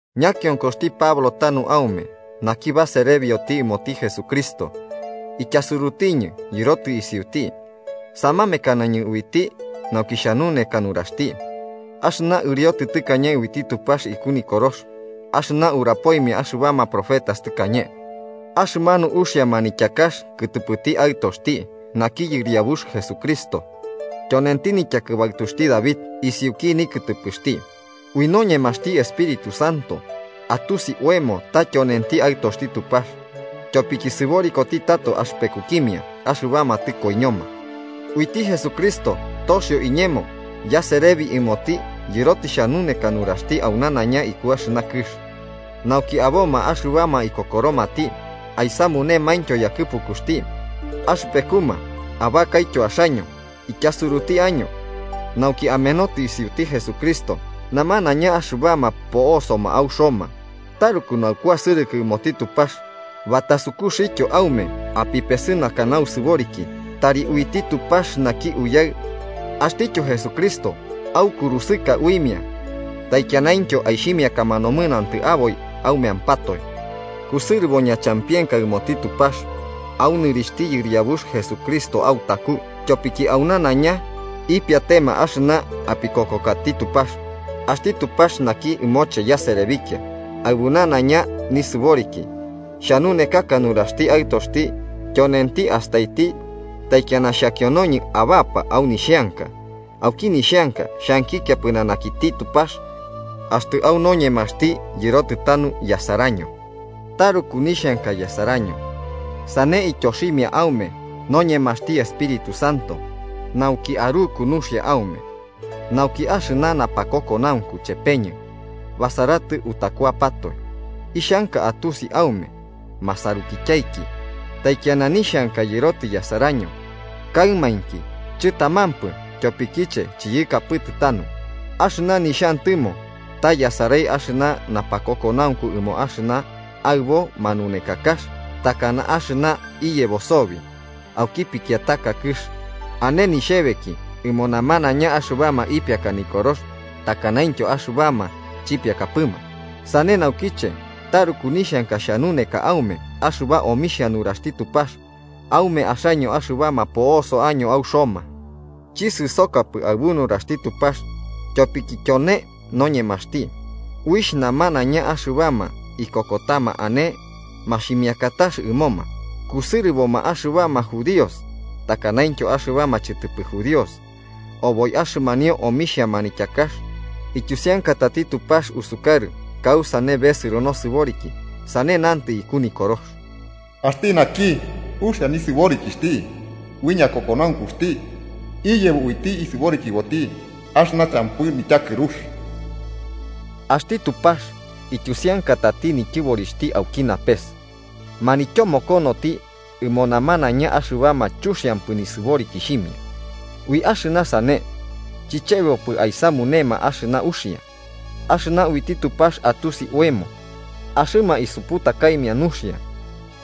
Ñakionkoxti Pablo tanu aume, naki baserebioti ɨmoti Jesucristo, ityasurutiñɨ yɨrotɨ isiuti, samamekanañɨ uiti nauki xhanuneka nuraxti. Axɨna ɨriotɨ tɨkañe uiti Tupax iku Nikorox axɨna urapoimia axɨbama profetas tɨkañe. Axɨmanu uxia manityakax kɨtɨpɨti Aɨtoxti, naki Yɨriabux Jesucristo, tyonenti nityakɨbaɨtuxti David isiuki nikɨtɨpɨxti. Ui noñemaxti Espíritu Santo atusi oemo ta tyonenti Aɨtoxti Tupax, tyopiki sɨborikoti tato axɨpekukimia axɨbama tɨkoiñoma. Uiti Jesucristo toxio iñemo yaserebi ɨmoti yɨrotɨ xhanuneka nuraxti au nanaiña iku axɨna kɨx, nauki aboma axɨbama ikokoromati aisamunemaintyo yakɨpukuxti. Axɨpekuma abakaityo axaño, ityasuruti año nauki amenotɨ isiuti Jesucristo. Namanaiña axɨbama po'osoma au Roma, taruku naukuasɨrɨkɨ ɨmoti Tupax batasukuxtyo aume apipesɨnaka nausɨboriki. Tari uiti Tupax naki Uyaɨ, axtityo Jesucristo aukurusɨka uimia taikianaintyo aixhimiakama nomɨnantɨ aboi aumeampatoe. Kusɨrɨbo ñachampienka ɨmoti Tupax, au nɨrixhti Yɨriabux Jesucristo autaku, tyopiki au nanaiña ipiatema axɨna apikokokati Tupax. Axti Tupax naki ɨmoche yaserebikia aɨbu nanaiña nisɨboriki, xhanunekaka nuraxti Aɨtoxti tyonenti astaiti taikiana xhakionoñɨ abapa au nixheanka, auki nixheanka xhankikia pɨnanakiti Tupax axtɨ au noñemaxti yɨrotɨ tanu yasaraño. Taruku nixhanka yasaraño, sane ityoximia aume noñemaxti Espíritu Santo, nauki aruku nuxia aume. Nauki axɨna napakokonaunku chepeñɨ basaratɨ utakuapatoe. Ixhanka atusi aume masarukityaiki, taikiana nixhanka yɨrotɨ yasaraño, kaɨmainki chɨtamampɨ tyopikiche chiyɨkapɨtɨ tanu. Axɨna nixhantɨmo ta yasarai axɨna napakokonaunku ɨmo axɨna aɨbo manunekakax, takana axɨna iyebo sobi auki pikiataka kɨx. Ane nixhebeki ɨmo namanaiña, axɨbama ipiakama nikorox takanaintyo axɨbama chipiakapɨma. Sane naukiche taruku nixhanka xhanuneka aume axɨba omixhia nuraxti Tupax aume axaño axɨbama po'oso año au Roma. Chisɨsokapɨ aɨbu nuraxti Tupax, tyopiki tyone noñemaxti, uixh namanaiña axɨbama ikokotama ane maximiakatax ɨmoma, kusɨrɨboma axɨbama judíos takanaintyo axɨbama chɨtɨpɨ judíos. Oboi axɨmanio omixhia manityakax ityusiankatati Tupax usukarɨ kausane besɨro nosɨboriki. Sane nantɨ iku Nikorox: “Axti naki uxia nisɨborikixhti ui ñakokonaunkuxti iyebo uiti isɨborikiboti axɨna champɨ nityakɨrux.” Axti Tupax ityusiankatati nityɨborixhti auki napes, manityomokonoti ɨmo namanaiña axɨbama chuxiampɨ nisɨborikixhimia ui axɨna sane chichebopɨ aisamunema axɨna uxia. Axɨna uiti Tupax atusi oemo, axɨma isuputakaimia nuxia,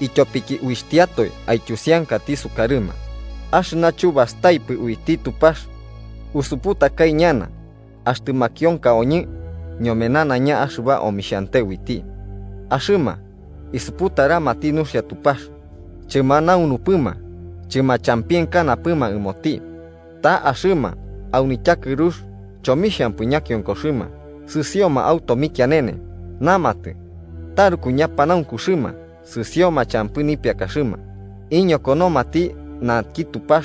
ityopiki uitiatoe aityusiankati sukarɨma. Axɨna chubastaipɨ uiti Tupax usuputakai ñana, axtɨ makionkaoñɨ ñome nanaiña axɨba omixhante uiti. Axɨma isuputaramati nuxia Tupax, chɨmanaunupɨma chɨmachampienkanapɨma ɨmoti. Ta axɨma au nityakɨrux chomixhampɨ ñakionkoxɨma sɨsioma au tomikianene. Namatɨ taruku ñapanaunkuxɨma, sɨsioma champɨ nipiakaxɨma. Iñokonomati naki Tupax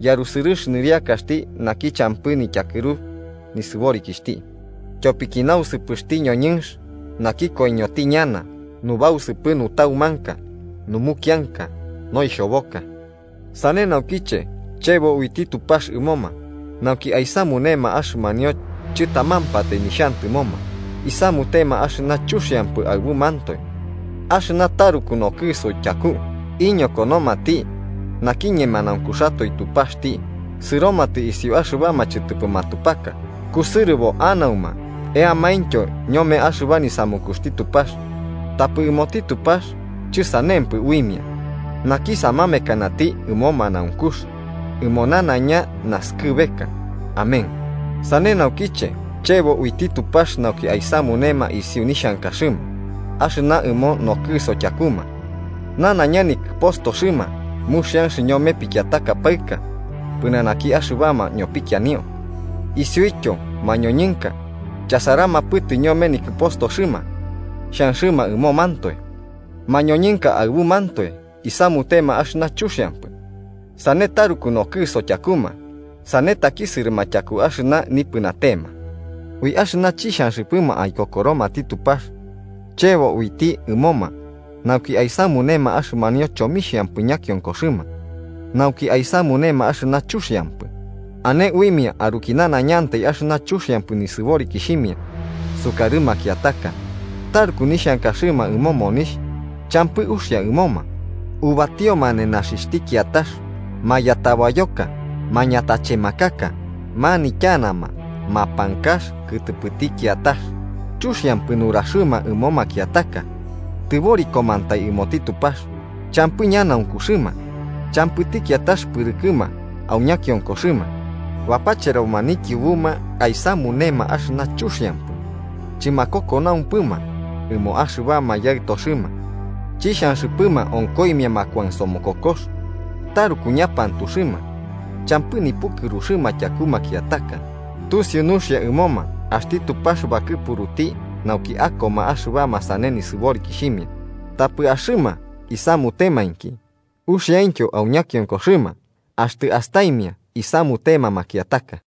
yarusɨrɨx nɨriakaxti naki champɨ nityakɨru nisɨborikixhti, tyopiki nausɨpɨtuxti ñoñɨnx naki koiñoti ñana, nubausɨpɨtu nutaumanka, numukianka noixhoboka. Sane naukiche chebo uiti Tupax ɨmoma, nauki aisamunema axɨmanio chɨtamampatai nixhantɨmoma, isamutema axɨna chuxiampɨ aɨbumantoe axɨna taruku nokɨso tyaku. Iñokonomati naki ñemanaunkuxatoe Tupaxti, sɨromatɨ isiu axɨbama chɨtɨpɨ matupaka, kusɨrɨbo anauma eamaintyo ñome axɨba nisamukuxti Tupax, tapɨ ɨmoti Tupax chɨsanempɨ uimia naki samamekanati ɨmo manaunkux ɨmo nanaiña naskɨbeka. Amén. Sane naukiche, chebo uiti Tupax nauki aisamunema isiu nixhankaxɨma axɨna ɨmo nokɨso tyakuma. Nanaiña nikɨpostoxɨma muxianx ñome pikiataka paɨka pɨnanaki axɨbama ñopikianio. Isiuityo mañoñɨnka chasaramapɨtɨ ñome nikɨpostoxɨma xhanxɨma ɨmomantoe. Mañoñɨnka aɨbumantoe isamutema axɨna chuxiampɨ, sane taruku nokɨso tyakuma, sane takisɨrɨma tyaku axɨna nipɨnatema. Ui axɨna chixhanxɨpɨma aikokoromati Tupax, chebo uiti ɨmoma nauki aisamunema axɨmanio chomixhampɨ ñakionkoxɨma, nauki aisamunema axɨna chuxiampɨ. Ane uimia aruki nanaiñantai axɨna chuxiampɨ nisɨborikixhimia sukarɨ makiataka, taruku nixhankaxɨma ɨmo monixh, champɨ uxia ɨmoma, ubatioma nenaxixhti kiatax, mayatabayoka, mañatachemakaka, manityanama mapankax kɨtɨpɨti kiatax. Chuxiampɨ nuraxɨma ɨmo makiataka, tɨborikomantai ɨmoti Tupax, champɨ ñanaunkuxɨma, champɨti kiatax pɨrɨkɨma au ñakiokoxɨma. Bapacheroma nikiubuma aisamunema axɨna chuxiampɨ, chɨmakokonaumpɨma ɨmo axɨbama yaɨtoxɨma, chixhanxɨpɨma onkoimia makuansomokokox, taruku ñapantuxɨma, champɨ nipukɨruxɨma tyaku makiataka. Tusiu nuxia ɨmoma axti Tupax bakɨpuruti nauki akoma axɨbama sane nisɨborikixhimia. Tapɨ axɨma isamutemainki, uxiaintyo au ñakionkoxɨma axtɨ astaimia isamutema makiataka.